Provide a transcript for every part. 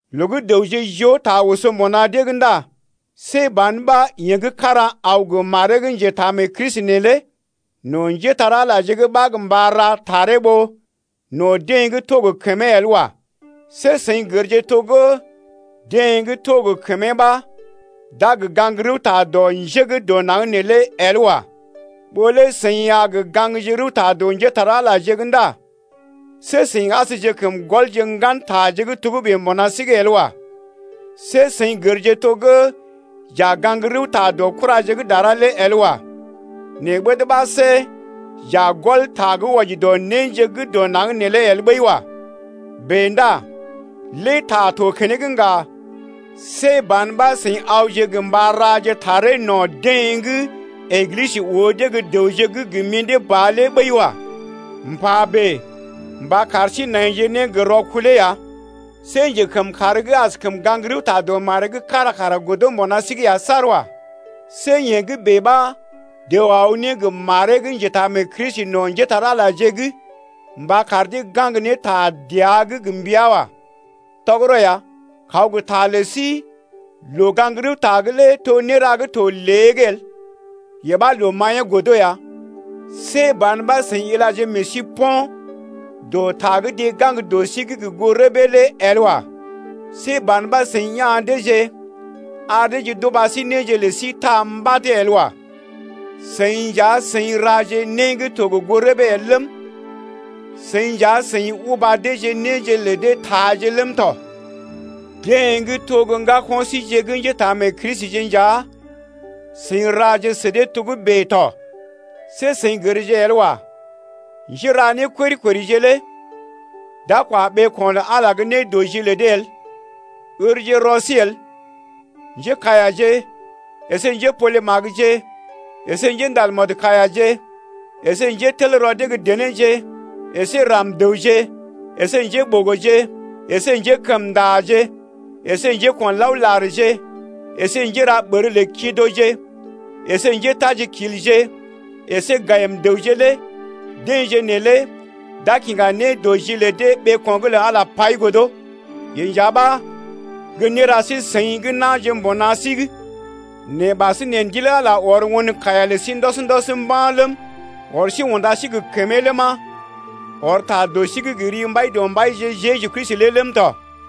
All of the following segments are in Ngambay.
Loo gə́ dəwje joo ta oso mbuna dee’g ndá see ban ɓa yeḛ gə́ kára aw gə maree gə́ njetaamee-Kristi neelé no̰ njépole-magəje’g ɓa gə mba ra taree ɓó no̰ deḛ gə́ to gə kəmee’g el wa. See seḭ gərje to gə́ deḛ gə́ to gə kəmee ɓa d’a gə gaŋg rəwta dɔ njé gə́ dɔ naŋg neelé el wa. Ɓó lé seḭ a gə gaŋgje rəwta dɔ njépole-magəje’g ndá see seḭ asjekəm gɔlje ŋgan taje gə́ togə́bè mbuna sí’g el wa. See seḭ gərje to gə́ j’a gaŋg rəwta dɔ kuraje gə́ dara lé el wa. Nɛ ɓəd ɓa see j’a gɔl ta gə́ wɔji dɔ néje gə́ dɔ naŋg neelé el ɓəi wa. Bèe ndá lé ta to keneŋ ŋga, see ban ɓa seḭ awje gə mba raje taree no̰ deḛ gə́ Eglisə oo dee gə́ dəwje gə́ gə mḭdé ba lé ɓəi wa. M’pa bèe mba kar sí naije ne gə rɔkulee ya. See njekəmkàr gə́ askəm gaŋg rəwta dɔ maree’g kára kara godo mbuna sí’g ya saar wa. See yee gə́ bèe ɓa dəw aw ne gə maree gə́ njetaamee-Kristi no̰ njépole-magəje’g mba kar dee gaŋg ne ta dəa’g gə mbəa wa. Tɔgərɔ ya kaw gə ta lə sí loo-gaŋg-rəwta’g lé to néra gə́ to lée’g el, yee ɓa loo maḭyee godo ya. See ban ɓa seḭ ilaje meḛ sí po̰ dɔ ta gə́ deḛ gaŋg dɔ sí’g gə goo rəbee el lé wa. See ban ɓa seḭ ya̰ deeje ar deeje d’uba sí néje lə sí taa sí mbad el wa. Seḭ nja seḭ raje né gə́ to gə goo rəbee el ləm, seḭ nja seḭ uba deeje néje lə dee taaje ləm tɔ. Deḛ gə́ to gə́ ŋgako̰ síje gə́ njétaamee-Kristije nja seḭ raje sə dee togə́bè tɔ! See seḭ gərje el wa, njéra nékori-korije lé d’a kwa ɓeeko̰ lə Ala gə́ nédɔji lə dee el. Ǝrje rɔ sí el: njékaiyaje əsé njépole-magəje əsé gə njéndal mɔdkaiyaje əsé njételrɔ dee gə́ denéje əsé ram-dəwje əsé njéɓogoje əsé njékəmndaje əsé njéko̰laolarje əsé njéra ɓər lə kidoje əsé njétajikilje əsé gayim-dəwje lé deḛje neelé d’a kiŋga nédɔji lə dee ɓeeko̰’g lə Ala pai godo. Yee nja ɓa gə́ néra sí-seḭ gə́ na̰je mbuna sí’g. Nɛ ɓasinè Ndil Ala ɔr won kaiya lə sí ndɔs-ndɔs mba̰ ləm, ɔr sí ne unda sí gə kəmee ləma, ɔr ta dɔ sí’g gə ri Mbaidɔmbaije Jeju Kristi lé ləm tɔ.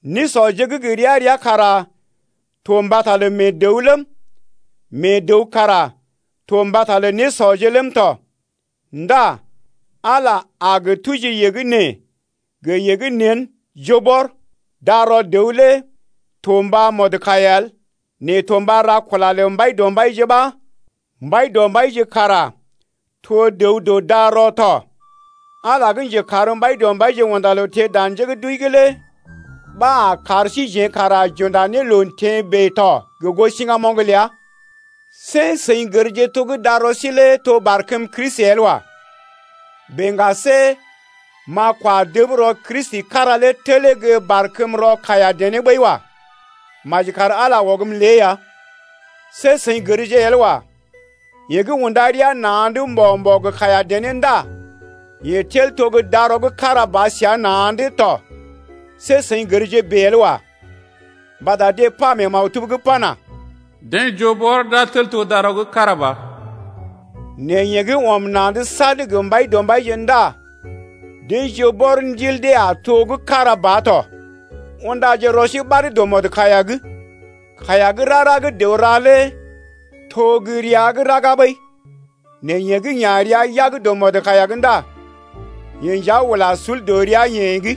Nésɔje gə́ gə ria-ria kara to mbata lə mee dəw ləm, mee dəw kara to mbata lə nésɔje ləm tɔ. Ndá Ala a gə tuji yee gə́ nee gə yee gə́ nḛ, joo bɔr. Darɔ dəw lé to mba mɔdkaiya el, nɛ to mba ra kula lə Mbaidɔmbaije ɓa Mbaidɔmbaije kara to dəw dɔ darɔ tɔ. Ala gə́ njekar Mbaidɔmbaije unda loo teḛ dan njé gə́ d’wəi’g lé ɓa a kar síjeḛ kara j’unda ne loo teḛ bèe to gə goo siŋgamoŋ ləa. See seḭ gərje to gə́ darɔ sí lé to barkəm Kristi el wa. Bèe ŋga see m’a kwa dəb rɔ Kristi kára lé telee gə́ barkəm rɔ kaiya-dené ɓəi wa. Maji kar Ala ɔgm lée ya! See seḭ gərje el wa, yeḛ gə́ unda rəa na̰’d mbo̰-mbo̰ gə kaiya-dené ndá yeḛ tel to gə́ darɔ gə́ kára ba səa na̰’d tɔ. See seḭ gərje bèe el wa. Mbata deḛ pa mee maktub’g pana: Deḛ joo bɔr d’a tel to darɔ gə́ kára ba. Nɛ yeḛ gə́ ɔm na̰’d sad gə Mbaidɔmbaije ndá deḛ joo bɔr ndil dee a to gə́ kára ba tɔ. Undaje rɔ sí ɓad dɔ mɔdkaiya’g. Kaiya gə́ rara gə́ dəw ra lé to gə́ rəa’g raga ɓəi. Nɛ yeḛ gə́ ya̰ rəa yag dɔ mɔdkaiya’g ndá yeḛ nja ula sul dɔ rəa-yeḛ’g.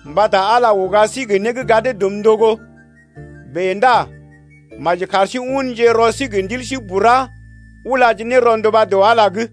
Mbata Ala uga sí gə né gə́ gadee dum ndogo. Bèe ndá maji kar sí unje rɔ sí gə ndil bura ulaje ne rɔnduba dɔ Ala’g.